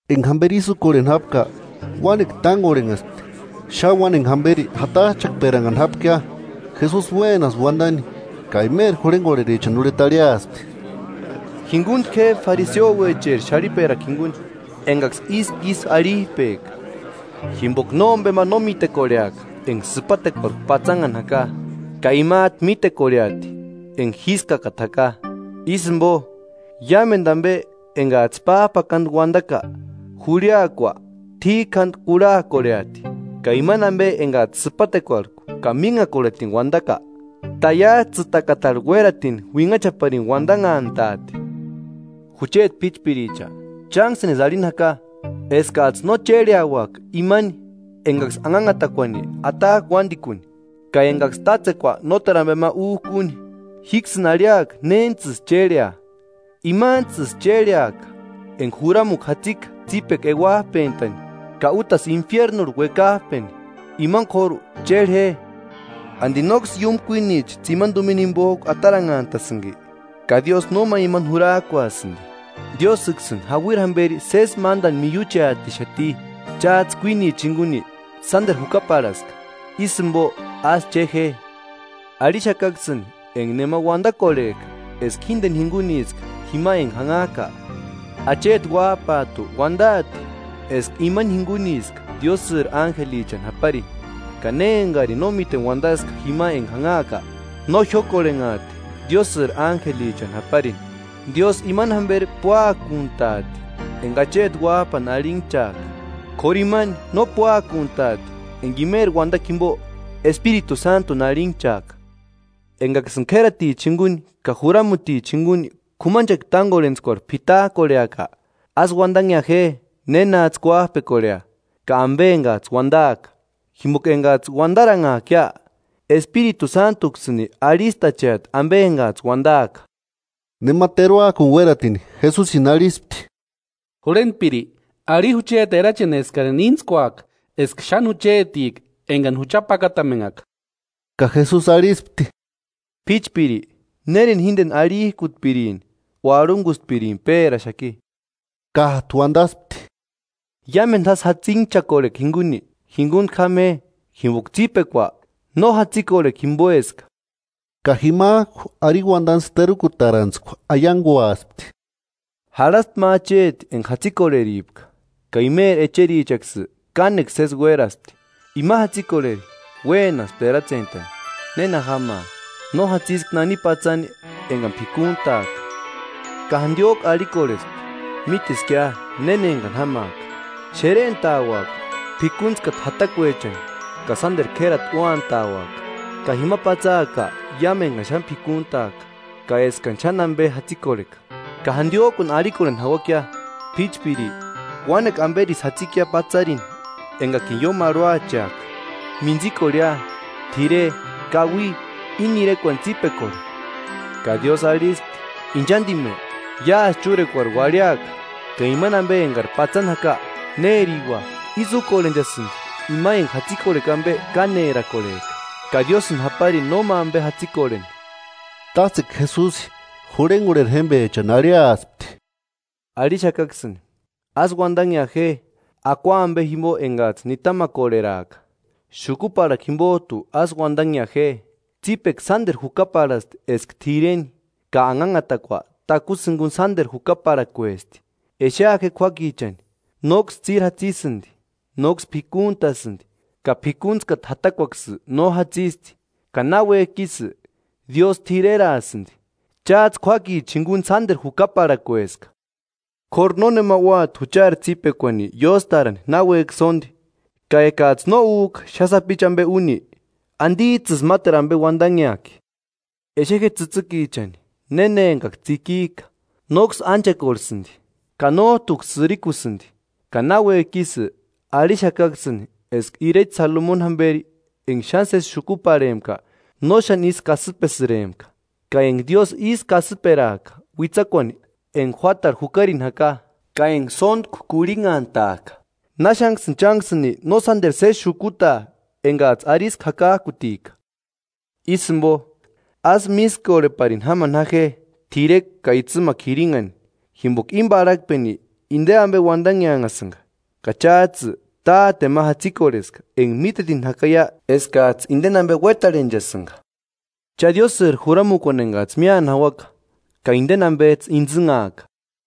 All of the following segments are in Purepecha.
Enga jamberi ísï úkorheni jápka, uánekua tángorhenhaspti, xáni uáni enga jamberi jatajchakperannhani jápkia. Jesusi uénaspti uandani ka imeri jurhengorherichani urheta arhiaspti: “Jinguntku je fariseouecheri xarhiperakua jinguni, engaksï ísku ísï arhijpejka. Jimboka nómbema no mítekorheaka enga sïpatekuarhku patsanhani jaka, ka imajtu mítekorheati enga jískakata jaka. Ísï jimbo, iámendu ambe engajtsï pájpakandu uandaka, jurhiakua t'íkjandu kurhakorheati; ka imani ambe engajtsï sïpatekuarhku ka mínhakorhetini uandaka, taiajtsïtakatarhu uératini uinhaparini uandanhantaati.” “Jucheti p'íchpiricha, chánksïnisï arhini jaka eskajtsï no chérheauaka imani engaksï anhanhatakuani atajka uándikuni, ka engaksï tátsekua nóteru ambe ma újka úni. Jíksïni arhiaka néntsïsï chérhea: Imantsïsï chérheaka enga juramukua jatsika tsípekua euajpentani ka útasï infiernurhu uekajpajpeni. Imani k'óru chérhe je.” “¿Andi nóksï iúmu kuinicha tsimani tumina jimbojku ataranhantasïnki? Ka Diósï nóma imani jurajkuasïndi. Diósïksïni jauiri jamberi sési mándani miucheatixati. Chájtsï kuínicha jinguni sánderu jukaparhaska, ísï jimbo ásï che je.” “Arhixakaksïni enga nema uandakorhejka eska jíndeni jinguniska jima enga janhaaka, acheti Uájpajtu uandaati eska imani jinguniska Diósïri ánjelichani japarini; ka ne engarini no míteni uandaska jima enga janhaaka, no jiókorhenhaati Diósïri ánjelichani japarini.” “Diósï imani jamberi púakuntaati enga acheti Uájpani arhinhchaaka; k'óru imani no púakuntaati enga imeri uandakua jimbo Espiritu Sántuni arhinhchaaka.” “Engaksïni k'ératichani jinguni ka juramutichani jinguni k'umanchekua tángorhentskuarhu p'itajkorheaka, ásï uandanhea je nénajtsï kuájpekorhea, ka ambe engajtsï uandaaka, jimboka engajtsï uandaranhaakia, Espiritu Sántuksïni arhistacheati ambe engajtsï uandaaka.” Nema teruakuni uératini Jesusini arhispti: –Jurhentpiri, arhi jucheti erachini eskarini íntskuaaka eska xáni juchetika engani jucha pakatamenhaka. Ka Jesusi arhispti: –P'íchpiri ¿Nérini jíndeni arhijkutpirini o arhungustpirini péraxaki? Kájtu uandaspti: –Iámendu jásï jatsinchakorhekua jinguni, jingunku jáma je; jimboka tsípekua no jatsikorhekua jimboeska. Ka jimajku arini uandantskua terukutarantskua aianguaspti: “Jarhaspti ma acheti enga jatsikorheripka, ka imeri echerichaksï kánekua sési uéraspti. Ima jatsikorheri uénaspti eratsentani ‘¿Néna jámaa? No jatsiska nani patsani engani p'ikuntaaka.’ Ka jandiojku arhikorhespti: ‘Míteskia néna engani jámaaka. Xerentauaka p'ikuntskata jatakuechani ka sánderu k'érati úantauaka, ka jima patsaaka iámu engani xáni p'ikuntaaka ka eskani xáni ambe jatsikorheka. Ka jandiojkuni arhikorheni jauakia: P'íchpiri, uánekua amberisï jatsikia patsarini engakini ióni marhuacheaka; mintsikorheia, t'ire, kaui, íni irekuani tsípekorhe.’ Ka Diósï arhispti: ‘Inchandime, iásï chúrekuari uarhiaka, ka imani ambe engari patsani jaka, ¿Nériua?’ Ísï úkorhenchasïndi ima enga jatsikorhekua ambe kánerakorhejka, ka Diósïni japarini nóma ambe jatsikorheni.” Tátsekua Jesusi jurhengorheri jémbechani arhiaspti: “Arhixakaksïni: Ásï uandanhea je akua ambe jimbo engajtsï nitamakorheraaka, xukuparhakua jimbojtu ásï uandanhea je. Tsípekua sánderu jukaparhasti eska t'ireni, ka anhanhatakua takusï jiguni sánderu jukaparhakuesti. Exea je k'uákichani: Nóksï tsíri jatsisïndi nóksï p'ikuntasïndi ka p'ikuntskata jatakuaksï no jatsisti, ka náuejki ísï, Diósï t'ireraasïndi. ¡Chájtsï k'uákicha jinguni sánderu jukaparhakueska! K'óru nónema úati juchari tsípekuani ióstarani náuejki sóndi, ka ekajtsï no újka xáni sapichu ambe úni, ¿Andijtsïsï máteru ambe uandanheajki?” “Exe je tsïtsïkichani néna engaksï tsikijka, nóksï ánchekorhesïndi, ka nójtuksï sïrikusïndi. Ka náuejki ísï, arhixakaksïni eska irecha Salomoni jamberi enga xáni sési xukuparhempka no xáni ísï kasïpesïrempka. Ka enga Diósï ísï kasïperajka uitsakuani enga juátarhu jukarini jaka, ka enga sóntku kurhinhantajka, ¡Náxanksïni chánksïni no sánderu sési xukutaa, engajtsï arisku jakajkutika! Ísï jimbo, ásï mískorheparini jámani ja je t'irekua ka itsïmakua jirinhani. Jimboka íni parhakpeni inde ambe uandanheanhasïnga, ka chájtsï Táteni ma jatsikorheska enga mítetini jakaia eskajtsï indeni ambe uétarhenchasïnga. Cha Diósïri juramukuani engajtsï míani jauaka, ka indeni ambejtsï intsïnhaaka.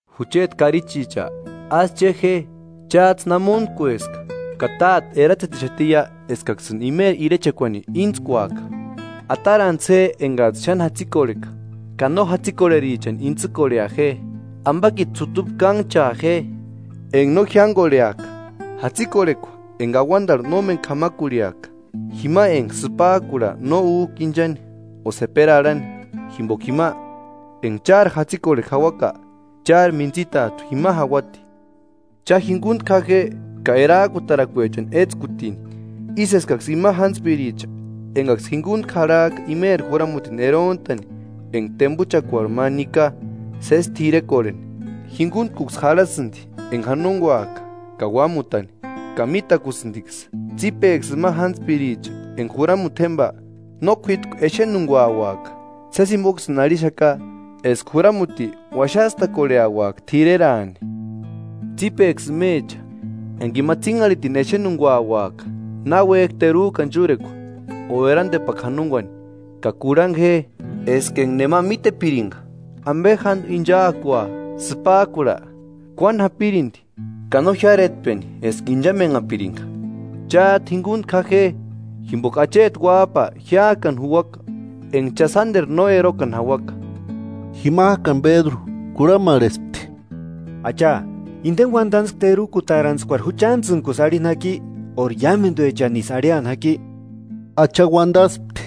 Jucheti karichicha, ásï che je, chájtsï namonkueska, ka Táte eratsetixatiia eskaksïni imeri irechekuani íntskuaka. Atarantsï je engajtsï xáni jatsikorheka, ka no jatsikorherichani intsïkorhea je; ambakiti sutupu kánhchaa je enga no jiángorheaka, jatsikorhekua enga auandarhu nómeni k'amakurhiaka, jima enga sïpajkurha no újka inchani o seperi arhani. Jimboka jima, enga chári jatsikorhekua jauaka, chári mintsitajtu jima jauati.” “Cha, jinguntku ja je ka erajkutarakuechani étskutini, ísï eskaksï ima jántspiricha engaksï jinguntku jarhajka imeri juramutini erontani enga tembuchakuarhu ma nika sési t'irekorheni, jinguntkuksï jarhasïndi enga janonguajka ka uámutani, ka mítakusïndiksï. Tsípeksï ima jántspiricha enga juramuti jémba no k'uítku exenunguauaka. Sési jimboksïni arhixaka eska juramuti uaxastakorheauaka t'ireraani. Tsípeksï imecha, enga ima tsínharhitini exenunguauaka náuejki terujkani chúrekua o erandepakua janonguani. Ka kurhangu je: Eska enga nema mítepiringa ambe jándu inchaakua sïpajkurha, kuáni japirindi ka no jiáretpeni eska inchamenhapiringa. Chájtu jingunku ja je; jimboka acheti Uájpa jiájkani juuaka enga cha sánderu no erokani jauaka.” Jimajkani Pédru kurhamarhespti: –Acha, ¿Indeni uandantskua terukutarantskuari juchantsïnkusï arhini jaki óri iámenduechanisï arhiani jaki? Acha uandaspti: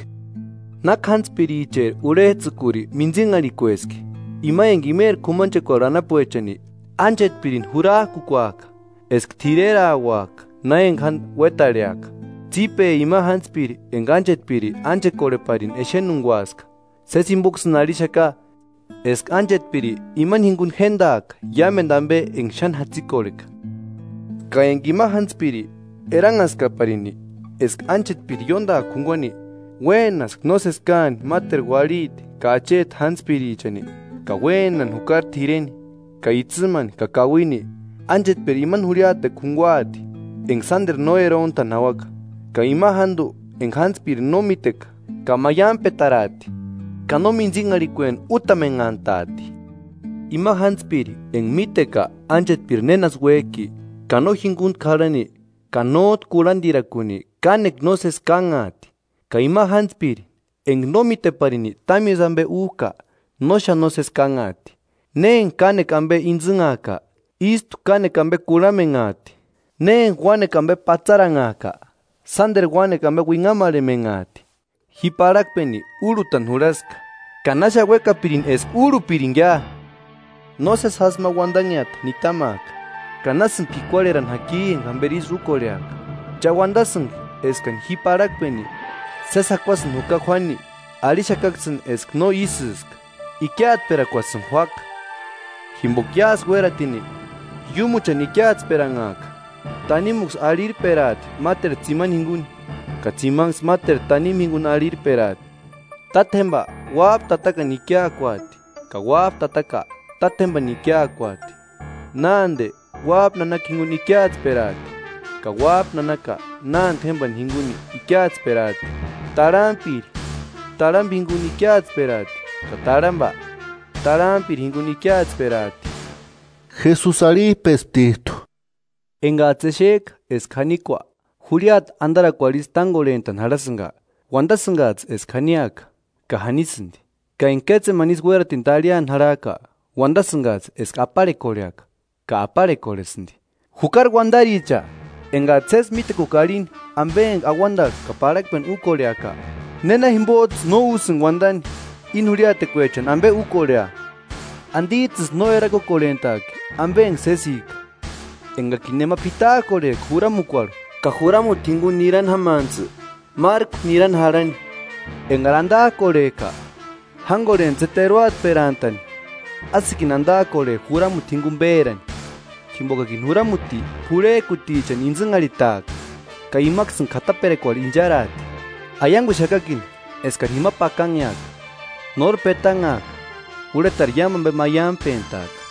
“¿Náki jántspiricheri urhejtsïkuri mintsinharhikueski? Ima enga imeri k'umanchekuarhu anapuechani ánchetpirini jurajkukuajka eska t'irerauaka na enga jándu uétarheaka. Tsípe ima jántspiri enga ánchetpiri ánchekorheparini exenunguaska. Sési jimboksïni arhixaka eska ánchetpiri imani jinguni jéndaaka iámendu ambe enga xáni jatsikorheka. Ka eka ima jántspiri, eranhaskaparini eska ánchetpiri ióndaaka junguani, uénaska nósesi káani máteru uarhiti ka acheti jántspirichani, ka uénani jukari t'ireni ka itsïmani ka kauini, ánchetpiri ima jurhiatekua junguaati enga sánderu no erontani jauaka, ka ima jándu enga jántspiri no míteka ka maiampetaraati ka no mintsinharhikueni útamenhantaati.” “Ima jántspiri enga míteka ánchetpiri nénasï uéjki, ka no jinguntku jarhani, ka nójtu kurhandirakuni, kánekua nósesi kánhaati. Ka ima jántspiri enga no míteparini támisï ambe újka, no xáni nósesi kánhaati. Ne enga kánekua ambe intsïnhajka ístu kánekua ambe kurhamenhaati; ne enga uánekua ambe patsaranhajka, sánderu uánekua ambe uinhamarhemenhaati.” “Ji parhakpeni úrhutani jurhaska ka ¡Náxani uékapirini eska úrhupiringia! No sési jásï ma uandanheata nitamaaka, ka ¡Násïni p'ikuarherani jaki enga jamberi ísï úkorheaka! ¿Cha uandasïnki eskani ji íni parhakpeni sési jakuasïni juka juáni? Arhixakaksïni eska no ísïska, ikiatsperakuasïni juáka. Jimboka iásï uénatini, iúmuchani ikiatsperanhaati, tanimuksï arhirperaati máteru tsimani jinguni, ka tsimanksï máteru tanimu jinguni arhirperaati. Táte, uájpa tatakani ikiaakuati ka uájpa tataka, tátjembani ikiakuaati; nánde, uájpa nanaka jinguni ikiatsperaati ka uájpa nanaka, nánde jémbani jinguni ikiatsperaati; tarhampiri, tarhamba jinguni ikiatsperaati ka tarhamba, tarhampiri jinguni ikiatsperaati.” Jesusi arhijpesptijtu: “Engajtsï exejka eska janikua jurhiata andarakuarhu ísï tángorhentani jarhasïnga, uandasïngajtsï eska janiaka, ka janisïndi. Ka enga kétsemani ísï uératini tarhiani jarhajka, uandasïngajtsï eska aparhekorheaka, ka aparhekorhesïndi. ¡Jukari uandaricha! Engajtsï sési mítekuka arhini ambe enga auandarhu ka parhakpeni úkorheaka, ¿Néna jimbojtsï no úsïni uandani íni jurhiatekuechani ambe úkorhea?” “¿Andijtsïsï no erakukorhentajki ambe enga sésika? Engakini nema p'itajkorhejka juramukuarhu ka juramuti jinguni nirani jámantsï márku nirani jarhani, engari andajkorhejka, jángorhentsï je teruatperantani, ásïkini andajkorhe juramuti jinguni pérani; jimbokakini juramuti p'urhejkutichani intsïnharhitaaka ka imaksïni k'ataperakuarhu incharaati. Aianguxakakini eskari jima pakanheaka, nóri petanhaaka, urhetari iámu ambe maiampentaaka.”